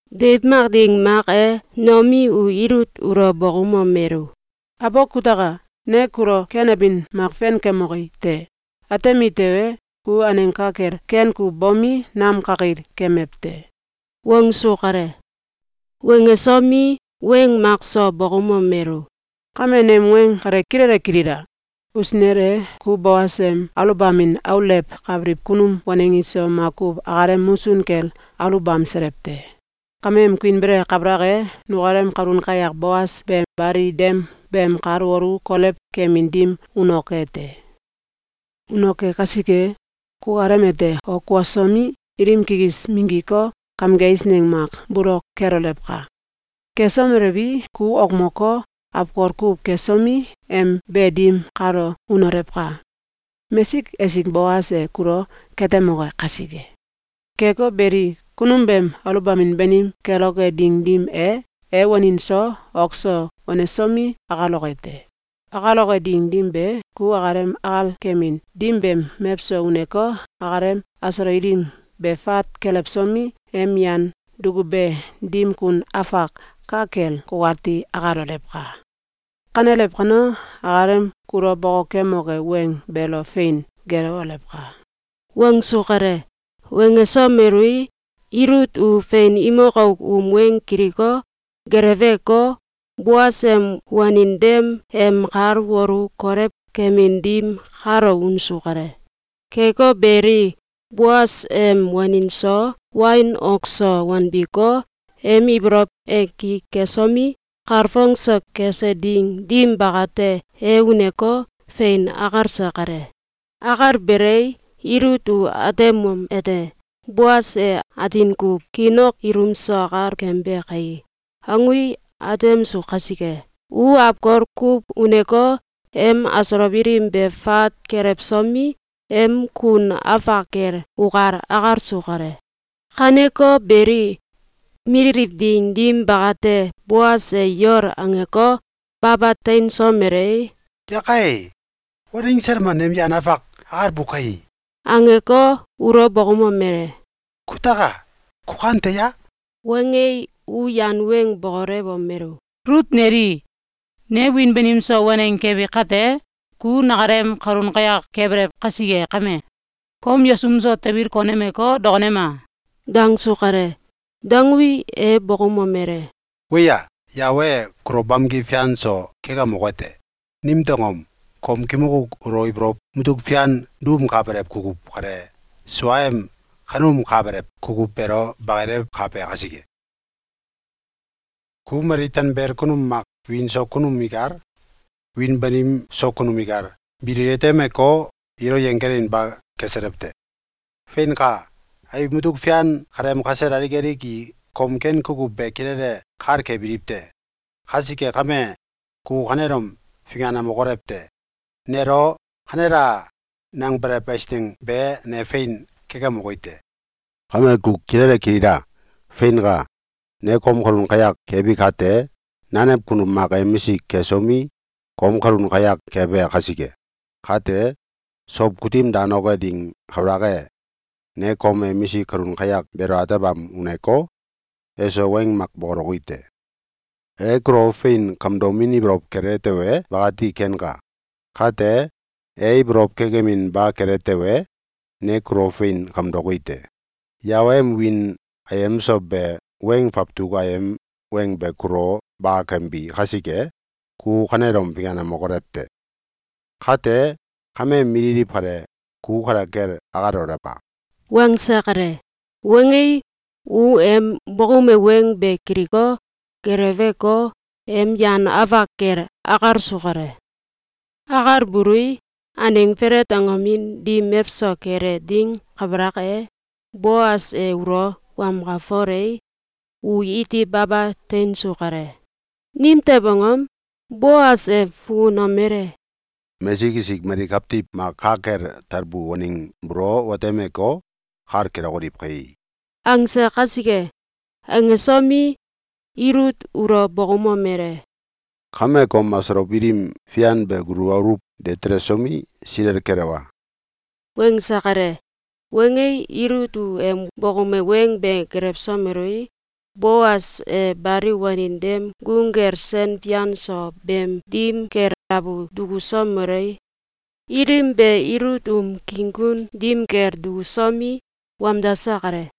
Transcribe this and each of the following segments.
Deiw mak ding mak e, Noomi u Ilut ulo bokoumomelu: “Abok kutaka! Ne kulo ken abin mak fenkemoki te. Atemi tewe, ku aneng ka kel ken kuw bomi, nam kakil kemew te.”, wangsu kale. Wangesomi, weng mak so bokoumomelu: “Kame nem weng kale kilele kilila! Usinel e, ku Boas em aluwbamin aulewkabiliw kunum waneng iso makuw akalem musun kel aluwbamselew te. Kameem kuinbele kabalak e, nukalem kalun kayak Boas be bali dem beem kal wolu kolew kemin dim unoke te. Unoke kasike, kukalem ete ok kuosomi, ilim kikis minggiko, kamge eisneng mak bolok kelolewka! Kesomelewi, ku okmoko, awkol kuw kesomi, em be dim kalo unolew ka! Mesik esik Boas e kulo katemoke kasike. Keko beli, kunum beem aluwbamin banim keloke ding dim e, e wanin so ok so wanesomi, akaloke te. Akaloke ding dim be, ku akalem akal kemin dim beem mewso uneko, akalem asolow ilim be fat kelewsomi, em yan dukube dim kun afak ka kel kukati akalolewka! Kanelew kano, akalem kulo bokokemoke weng beelo fein gelewolewka!”, wangsu kale. Wangesomelui, Ilut u fein imok auk um weng kiliko, geleweko, Boas em wanin dem em kal wolu kolew kemin dim kalo unsu kale. Keko beli, Boas em wanin so wain ok so wanbiko, em ibolow e ki kesomi, kalfong so kese ding dim bakate, e uneko, fein akalse kale. Akalbelei, Ilut u atemomete: ‘Boas e atin kuw kiin ok ilum so akal kembe kai!’, angui, atemsu kasike, u awkol kuw uneko, em asolow ilim be fat kelewsomi, em kun afak kel ukal akalsu kale. Kaneko beli, mililiw ding dim bakate, Boas e yol angeko, baba teinsomelei, “Yakai! Waneng sel mak nem yan afak akalbu kai!”, angeko, ulo bokoumomele: “Kutaka! Ku kante ya?”, wangei, u yan weng bokolewomelu: “Ilut neli! Ne wiin banim so waneng kebi kate, ku nakalem kalun kayak kebelew kasike kame, kom yesum so tabil konemeko, dokonema!”, dangsu kale. Dangui, e bokoumomele: “Weya! Yawe e kulo bamki fian so kekemoke te! Nimtew angom? Kimok auk ulo ibolow mutuk fian duumkabelew kukuw kale suaem kaneumkabelew kukuw beelo bakilewkabe kasike. Ku mali tanbel kunum mak, wiin so kunum ikal, wiin banim so kunum ikal, biilo yetemeko, ilo yenggelinba keselew te. Feinka! Abiw mutuk fian kaleem kasel alik alik i kom ken kukuw be kilele kal kebiliw te. Kasike kame, ku kanelom finganemokolew te! Nelo ‘Kanela!’, nangew eisneng be ne fein kekemoki te. Kame ku kilele kilila! Feinka! Ne kom kalun kayak kebi kate, nanew kunum mak emisik kesomi, kom kalun kayak kebe kasike. Kate, sow kutim danoke ding kabalak e, ne kom emisik kalun kayak beelo atebam uneko, eso weng mak bokoloki te. E kulo fein kamdomin ibolow kele tewe, bakati kenka. Kate, e ibolow kekeminba kele tewe, ne kulo fein kamdoki te. Yawe em wiin ayem so be weng fawtuk ayem weng be kulo bakakembi kasike, ku kanelom finganemokolew te! Kate kameem mililiw kale, ku kale kel akalolewka!”, wangse kale. Wangei, u em bokoume weng be kiliko, geleweko, em yan afak kel akalsu kale. Akalbului, aneng felet angomin dim mewso kele ding kabalak e, Boas e ulo wamkalfolei, u iti baba teinsu kale. Nimtew angom? Boas e fukunomele: “Mesik esik mali kawtiw mak ka kel talbu waneng buulo watemeko, kal kelokoliw kai!”, angse kasike. Angesomi, Ilut ulo bokoumomele: “Kame, kom asolow ilim fian be gulu aluw de telsomi, silel kelewa!”, wangse kale. Wangei, Ilut u em bokoume weng be gelewsomelui, Boas e bali wanin dem gung kel sen fian so beem dim kel abu dukusomelei, ilim be Ilut um king kun dim kel dukusomi, wamdase kale.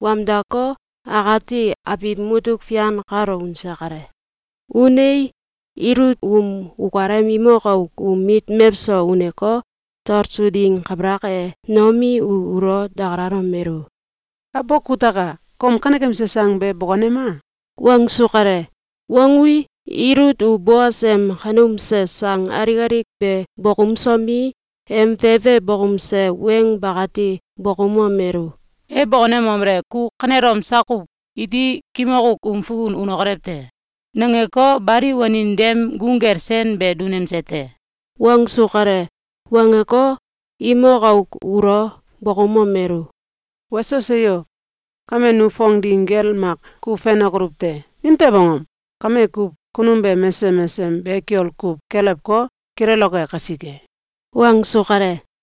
Wamdako, akati abiw mutuk fian kalo unse kale. Unei, Ilut um ukalem imok auk um mit mewso uneko, talsu ding kabalak e, Noomi u ulo dakalalomelu: “Abok kutaka! Kom kanekemse sang be bokonema!”, wangsu kale. Wangui, Ilut u Boas em kaneumse sang alik alik be bokoumsomi, em fefe bokoumse weng bakati bokoumomelu: “E bokonemomele: ‘Ku kanelom sak kuw iti kimok auk um fukun unokolew te!’, nangeko, bali wanin dem gung kel sen sel be dunemse te.”, wangsu kale. Wangeko, imok auk ulo bokoumomelu: “Weso seyo! Kame nu fong ding gel makuw fenokoluw te. Nimtew angom? Kame kuw, kunum be mesesem mesesem be kiol kuw kelewko, kileloke kasike.”, wangsu kale.